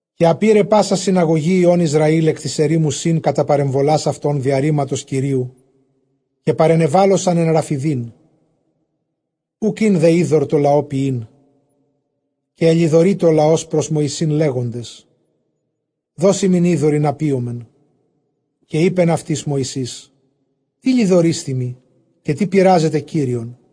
Καὶ ἀπῇρε πᾶσα συναγωγὴ υἱῶν Ἰσραὴλ ἐκ τῆς ἐρήμου Σὶν κατὰ παρεμβολὰς αὐτῶν, διὰ ῥήματος Κυρίου· καὶ παρενεβάλοσαν ἐν Ῥαφιδείν· οὐκ ἦν δὲ ὕδωρ τῷ λαῷ πιεῖν. Καὶ ἐλοιδορεῖτο ὁ λαὸς πρὸς Μωυσῆν, λέγοντες, δὸς ἡμῖν ὕδωρ, ἵνα πίωμεν· καὶ εἶπεν αὐτοῖς Μωυσῆς, τί λοιδορεῖσθέ μοι, καὶ τί πειράζετε Κύριον;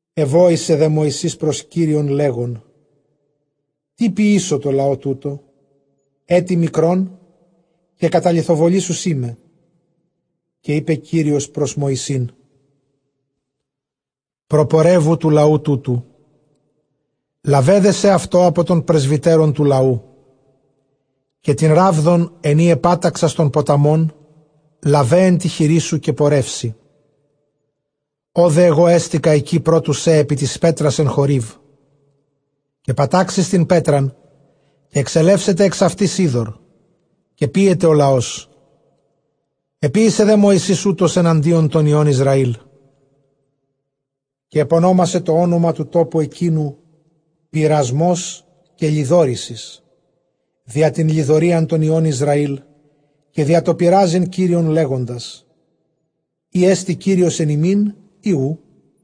Ἐβόησε δὲ Μωυσῆς πρὸς Κύριον, λέγων, τί ποιήσω τῷ λαῷ τούτῳ; ἔτι μικρὸν, καὶ καταλιθοβολὴσουσί με. Καὶ εἶπε Κύριος πρὸς Μωυσῆν, προπορεύου τοῦ λαοῦ τούτου· λάβε δὲ σεαυτῷ ἀπὸ τῶν πρεσβυτέρων τοῦ λαοῦ· καὶ τὴν ῥάβδον, ἐν ᾗ ἐπάταξας τὸν ποταμὸν, λάβε ἐν τῇ χειρί σου, καὶ πορεύσῃ. Ὅδε ἐγὼ ἕστηκα ἐκεῖ πρὸ τοῦ σὲ ἐπὶ τῆς πέτρας ἐν Χωρήβ· καὶ πατάξεις τὴν πέτραν, καὶ ἐξελεύσεται ἐξ αὐτῆς ὕδωρ, καὶ πίεται ὁ λαός. Ἐποίησε δὲ Μωυσῆς οὕτως ἐναντίον τῶν υἱῶν Ἰσραήλ. Καὶ ἐπωνόμασε τὸ ὄνομα τοῦ τόπου ἐκείνου, Πειρασμὸς, καὶ Λοιδόρησις, διὰ τὴν λοιδορίαν τῶν υἱῶν Ἰσραὴλ, καὶ διὰ τὸ πειράζειν Κύριον, λέγοντας, εἰ ἔστι Κύριος ἐν ἡμῖν, ἢ οὔ;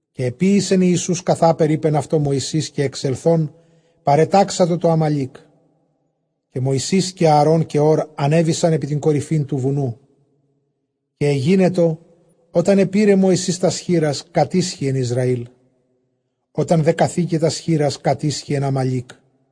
Καὶ ἐποίησεν Ἰησοῦς καθάπερ εἶπεν αὐτῷ Μωυσῆς, καὶ ἐξελθὼν παρετάξατο τῷ Ἀμαλήκ· καὶ Μωυσῆς καὶ Ἀαρὼν καὶ Ὢρ ἀνέβησαν ἐπὶ τὴν κορυφὴν τοῦ βουνοῦ. Καὶ ἐγένετο ὅταν ἐπῇρε Μωυσῆς τὰς χεῖρας, κατίσχυεν Ἰσραήλ· ὅταν δὲ καθῆκε τὰς χεῖρας, κατίσχυεν Ἀμαλήκ.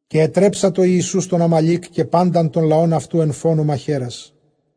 Καὶ ἐτρέψατο Ἰησοῦς τὸν Ἀμαλὴκ, καὶ πάντα τὸν λαὸν αὐτοῦ ἐν φόνῳ μαχαίρας.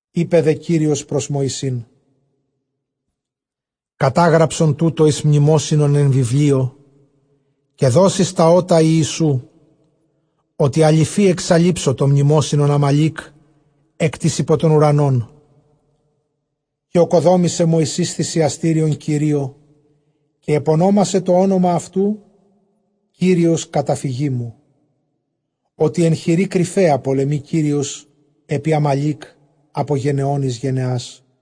Εἶπε δὲ Κύριος πρὸς Μωυσῆν, Κατάγραψον τοῦτο εἰς μνημόσυνον εἰς βιβλίον, καὶ δὸς εἰς τὰ ὦτα Ἰησοῖ· ὅτι ἀλοιφῇ ἐξαλείψω τὸ μνημόσυνον Ἀμαλὴκ ἐκ τῆς ὑπὸ τὸν οὐρανόν. Καὶ ᾠκοδόμησε Μωυσῆς θυσιαστήριον Κυρίῳ· καὶ ἐπωνόμασε τὸ ὄνομα αὐτοῦ, Κύριος καταφυγή μου. Ὅτι ἐν χειρὶ κρυφαίᾳ πολεμεῖ Κύριος ἐπὶ Ἀμαλὴκ ἀπὸ γενεῶν εἰς γενεάς.